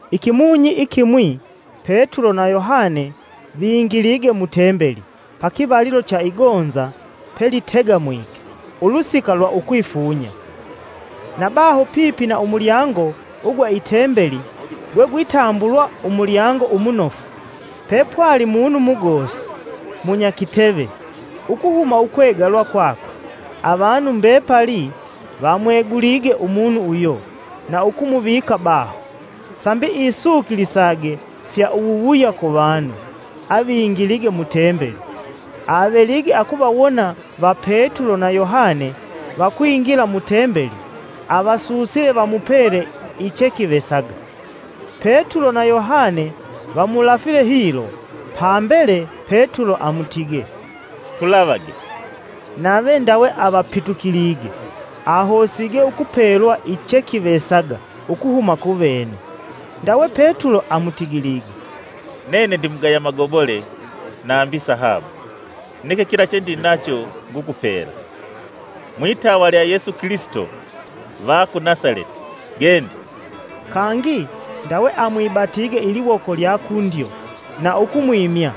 Ikimunyi ikimwi, Petulo na Yohane vingilige mu Tembeli pakivalilo cha igonza pelitegamwike ulusika lwa ukwifunya. Na baho pipi na umulyango ugwa i Tembeli, gwegwitambulwa “Umulyango umunofu,” pepwali munu mugosi, munyakiteve ukuhuma ukwegalwa kwakwe. Avanu mbepali vamwegulige umunu uyo na ukumuvika baho, sambi isukilisage fya uwuwuya kuvanu avingilige mu Tembeli. Avelige akuvawona va Petulo na Yohane vakwingila mu Tembeli, avasusile vamupele ichekivesaga. Petulo na Yohane vamulafile hilo, pambele Petulo amutigee, “Tulavage!” Nave ndawe avapitukilige, ahosige ukupelwa ichekivesaga ukuhuma kuvene. Ndawe Petulo amutigilige, “Nene ndimugaya magobole nambi sahabu, neke kila chendinacho ngukupela. Mwitawa lya Yesu Kilisito va ku Nasaleti, gende!” Kangi, ndawe amwibatige iliwoko lya kundyo, na ukumwimya.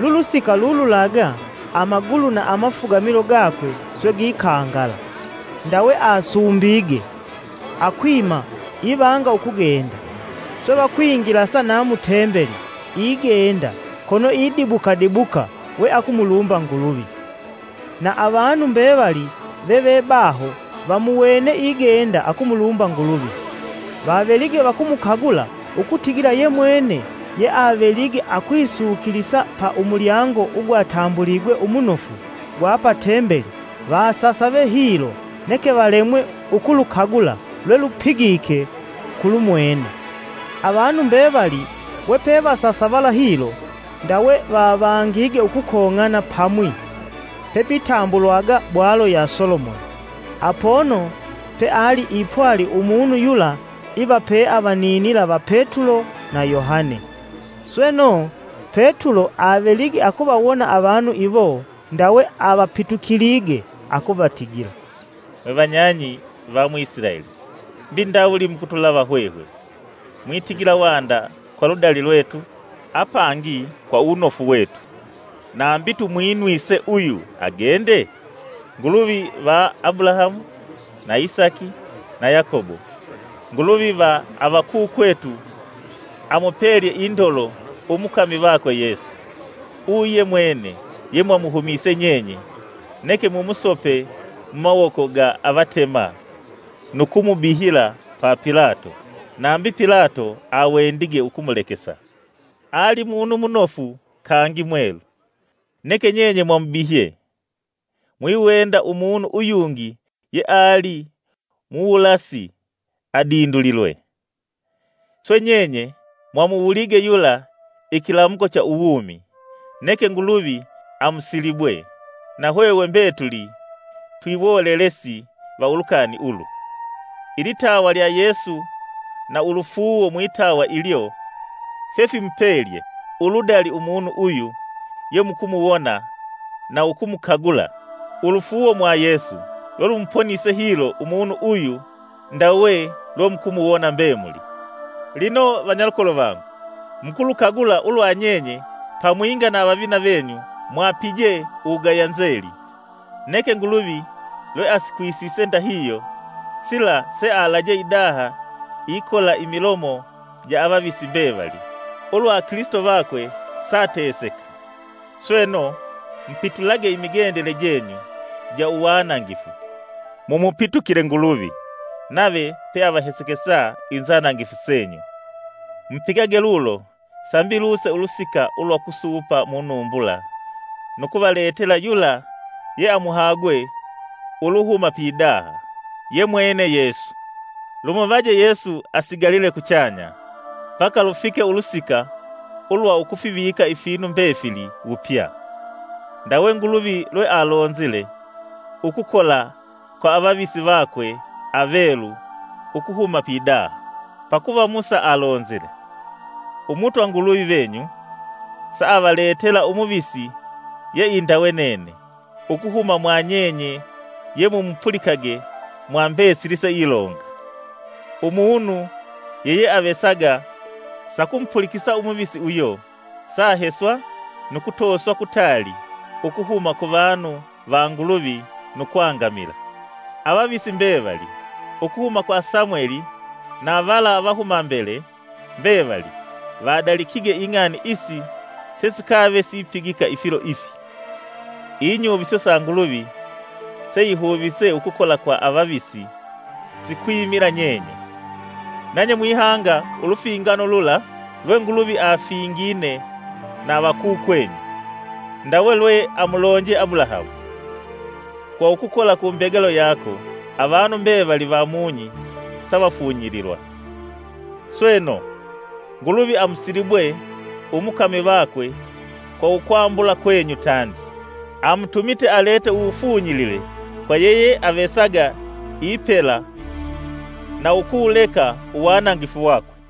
Lulusika lululaga amagulu na amafugamilo gakwe swe gikangala. Ndawe asumbige, akwima ivanga ukugenda. Swe vakwingilasa na mu Tembeli igenda, kono idibuka dibuka we akumulumba Nguluvi. Na avanu mbevali vevebaho vamuwene igenda akumulumba Nguluvi. Vavelige vakumukagula ukutigila yemwene yeavelige akwisukilisa pa “Umulyango ugwatambuligwe Umunofu” gwa pa Tembeli, vasasave hilo neke valemwe ukulukagula lwelupigike kulumwene. Avanu mbevali wepevasasavala hilo, ndawe vavangige ukukong'ana pamwi pepitambulwaga “Bwalo ya Solomoni,” apono peali ipwali umunu yula iva peavaninila va Petulo na Yohane. Sweno, Petulo avelige akuvawona avanu iwo ndawe avapitukilige akuvatigila, “Mwevanyang'i va mu Isilaeli mbi ndawuli mukutulava hwehwe, mwitigila wanda kwa ludali lwetu, apangi kwa uwunofu wetu nambi tumwinwise uyu agende? Nguluvi va Abulahamu na Isaki na Yokobo, Nguluvi va avakukwetu amupelye indolo umukami vakwe Yesu. Uyu yemwene yemwamuhumise nyenye, neke mumusope mumawoko ga avatema nu kumubihila pa Pilato, nambi Pilato awendige ukumulekesa. Ali munu munofu kangi mwelu, neke nyenye mwamubihye, mwiwenda umunu uyungi yeali muwulasi adindulilwe. Swe nyenye mwamuwulige yula ikilamuko cha uwumi. Neke Nguluvi amusilibwe, na hwehwe mbetuli twiwolelesi va ulukani ulu. Ilitawa lya Yesu na ulufuuwo mwitawa ilyo fyefimupelye uludali umunu uyu yemukumuwona na ukumukagula. Ulufuuwo mwa Yesu, lwelumuponise hilo umunu uyu ndawe lwemukuwona mbemuli. “Lino vanyalukolo vangu, mukulukagula ulwa nyenye pamwinga na avavina venyu mwapije uwugaya nzeli. Neke Nguluvi lweasikwisise ndahihyo, sila sealaje idaha ikola imilomo ja avavisi mbevali, ulwa Kilisito vakwe saateseka. Sweno, mupitulage imigendele jenyu ja uwanangifu, mumupitukile Nguluvi, nave peavahesekesa inzanangifu senyu, Mupigage lulo sambi luse ulusika lwa ukusupa munumbula nukuvaletela yula yeamuhagwe uluhuma pidaha, yemwene Yesu. Lumuvaje Yesu asigalile kuchanya mbaka lufike ulusika ulwa ukufivika ifinu mbefili wupya, ndawe Nguluvi lwealonzile ukukola kwa avavisi vakwe avelu ukuhuma pidaha. Pakuva Musa alonzile, ‘Umutwa Nguluvi venyu saavaletela umuvisi yeindawe nene ukuhuma mwa nyenye ye mumupulikage mwa mbesili seilonga. Umunu yeyeavesaga sakumupulikisa umuvisi uyo saaheswa nu kutoswa kutaali ukuhuma ku vanu va Nguluvi nu kwangamila.’ Avavisi mbevali, ukuhuma kwa Samweli na vala avahumambele mbevali, vadalikige ing'ani isi sesikave sipigika ifilo ifi. Inyuviso sa Nguluvi seihuvise ukukola kwa avavisi sikwimila nyenye; nanye mwihanga ulufingano lula lwe Nguluvi afingine na avakukwenyu, ndawe lwe amulonje Abulahamu: ‘Kwa ukukola ku mbegalo yako, avanu mbevali va mung'i savafunyililwa,’ Sweno, Nguluvi amusilibwe umukami vakwe kwa ukwambula kwenyu tandi, amutumite alete uwufunyilile kwa yeyeavesaga ipela na ukuwuleka uwanangifu wakwe.”